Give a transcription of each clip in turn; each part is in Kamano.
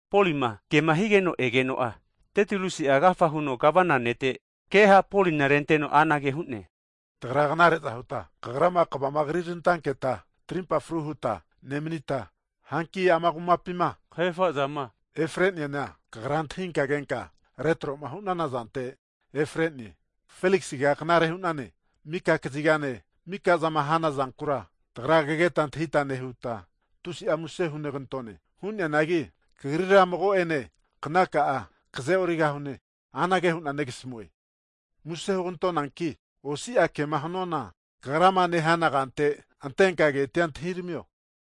Polima kema higeno egeno'a, Tetilusi'a agafa huno Gavana ne'te ke ha' Polina renteno anage hu'ne, Tagra knare'za huta kagrama kavama krirantanketa tarimpa fru huta nemanita, hanki ama kumapima kahefa'zama efare'neana kagrama antahinka kenka retro'ma hanazante efare'ne. Feliksiga knare hu'nane. Mika kazigane, mika zama hanazankura tagra kageta antahita nehuta tusi'a muse hunegantone. Hu'neanagi kagrira mago'ene knaka'a kaze'origahuankina anage hu'na negasmue, muse hugantonanki osia kema hanuana kagrama nehana kante antenka ketia antahiramio.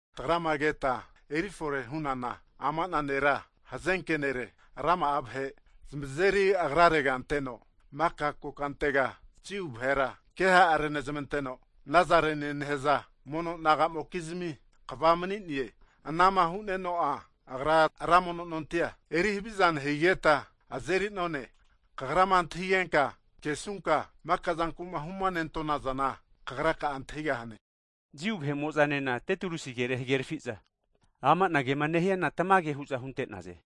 Tagrama keta eri fore hunana ama'na nera hazanke nere, rama'a vahe zamazeri agrarega anteno, maka kokantega Jiu vahera keha renezmanteno, Nazarenie nehaza mono naga'mokizmi kva mani'ne. Anama hu'neno'a, agra ra mono nontia eri haviza nehigeta azeri none. Kagrama antahingenka kesunka maka'zanku'ma huma nentonazana kagraka'a antahigahane. Jiu vahe'mo'zanena Tetilusi kere hagerafi'za, ama'na kema nehiana tamage hu'za hunte'naze.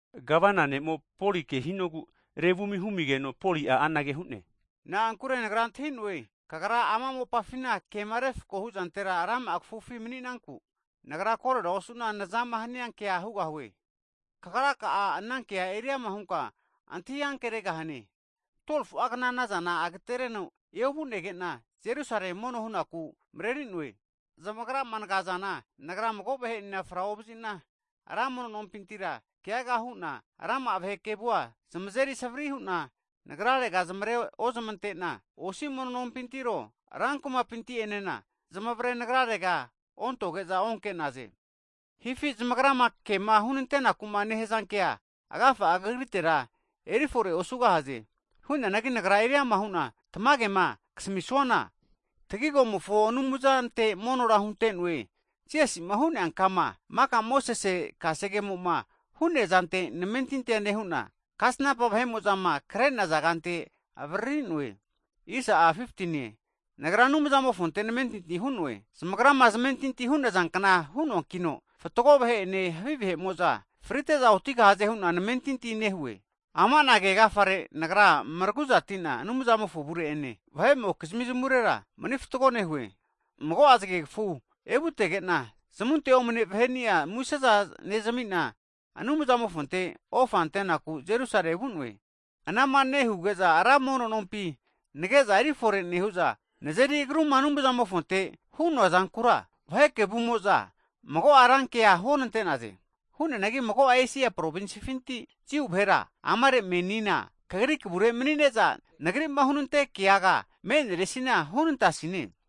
Gavana ne'mo Poli ke hinogu revumi humigeno, Poli'a anage hu'ne, Na'ankure nagra antahi'noe, kagra ama mopafina kema refakohu zantera rama'a kafufi mani'nanku, nagra korera osu'na nazama hania kea hugahue. Kagra ka'a ana kea eriama hunka antahi ankeregahane, 12fu'a kna'nazana agatereno eovu'nege'na Jerusale mono hu'naku mareri'noe. Zamagrama nagazana, nagra mago vahe'enena fra ovazi'na, ra mono nompintira keaga hu'na, rama'a vahe kevua zamazeri savari hu'na nagrarega zamare'ozmante'na, osi mono nonpintiro rankumapinti'enena zamavre nagrarega ontoge'za onke'naze. Hankinka zamagrama kema hunante'nakuma nehaza ke agafa'a kagritera eri forera osugahaze. Hu'neanagi nagra huama hu'na tamagema kasamisuana, tagigomofo Anumzante monora hunte'noe, Jisasi'ma hu'nea Kama, (sektie hu'zama nehazare) maka Mosesi Kasegemo'ma hu'neazante namentinti nehu'na, kasnampa vahe'mo'zama kre'naza kante avaririnoe. Nagra Anumzamofonte namentinti hu'noe, zamagrama zamentinti hu'naza kna hu'noankino, fatgo vahe'ene, havi vahe'mo'za frite'za otigahaze hu'na namentinti nehue. Ama'na ke agafare, nagra maragu'zatina Anumzamofo avure'ene, vahe'mokizmi zamurera mani fatgo nehue. Mago'a zagegafu evutege'na, zamunte omane vahe'nia, museza (gift) nezami'na, Anumzamofonte ofa antenaku Jerusalea vu'noe. Anama nehuge'za ra mono nompi nage'za eri fore nehu'za, nazeri agruma Anumzamofonte hu'noa zankura, vahe kevumo'zo mago'a rankea huonante'naze. Hu'neanagi mago'a Esia provinsifinti Jiu vahera, amare menina kagri kavure mani'ne'za, nagrima hunante keaga me'neresina hunantasine.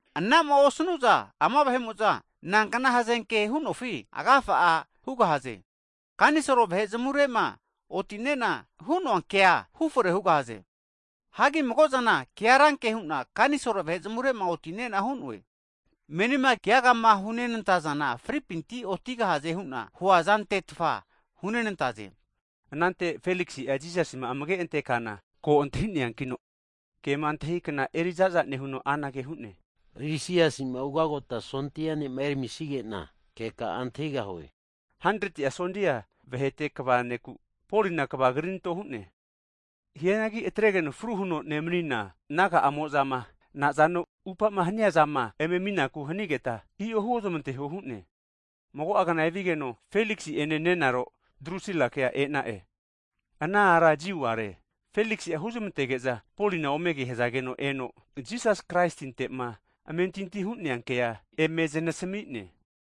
Anama osanu'za ama vahe'mo'za, nankna hazenke hu'nofi agafa'a hugahaze. Kanisol vahe zamure'ma oti'nena hu'noa kea hufore hugahaze. Hagi mago'zana kea ranke hu'na kanisol vahe zamure'ma oti'nena hu'noe. Menina keagama hunenantazana fripinti otigahaze hu'na huazante hunenantaze. Anante Feliksi'a Jisasima amage'ma antekana ko antahi'neankino, kema antahi kna eriza'za nehuno anage hu'ne, Lisiasi'ma ugagota sondia kva ne'ma eramisige'na keka'a antahigahue huteno, 100ti'a sondia vahete kva (sensulien) ne'ku Polina kava karinto hu'ne. Hianagi atregeno fru huno nemanina naga'amo'zama nazano upama haniazama eme aminaku hanigeta, i'o huozmanteho hu'ne. Mago'agna evigeno, Feliksi ene nenaro Drusilake e'na'e, ana ara Jiu a're. Feliksi'a huzmantege'za Polina ome kehazageno eno, Jisas Kraisinte'ma amentinti hu'nea kea eme zanasmi'ne.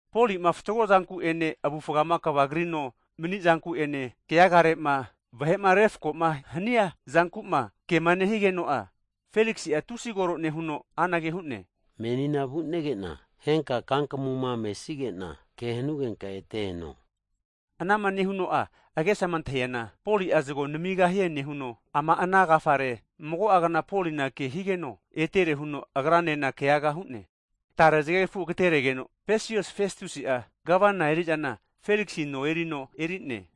Polima fatgo zanku'ene, avufama kava krino manizanku'ene keagare'ma vahe'ma refako'ma hania zanku'ma kema nehigeno'a, Feliksi'a tusi koro nehuno anage hu'ne, Menina vu'nege'na henka kankamuma mesige'na ke hanugenka ete eno huno asami'ne. Anama nehuno'a agesama antahi'ana Poli'a zago namigahie nehuno, ama ana agafare mago'agna Polina ke higeno etere huno agranena keaga hu'ne. Tare zgegafu agateregeno'a, Pesius Festusi'a, Gavana eri'zana Feliksi no erino eri'ne,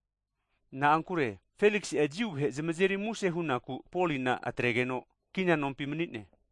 na'ankure Feliksi'a Jiu vahe zamazeri muse hu'naku Polina atregeno kina nompi mani'ne.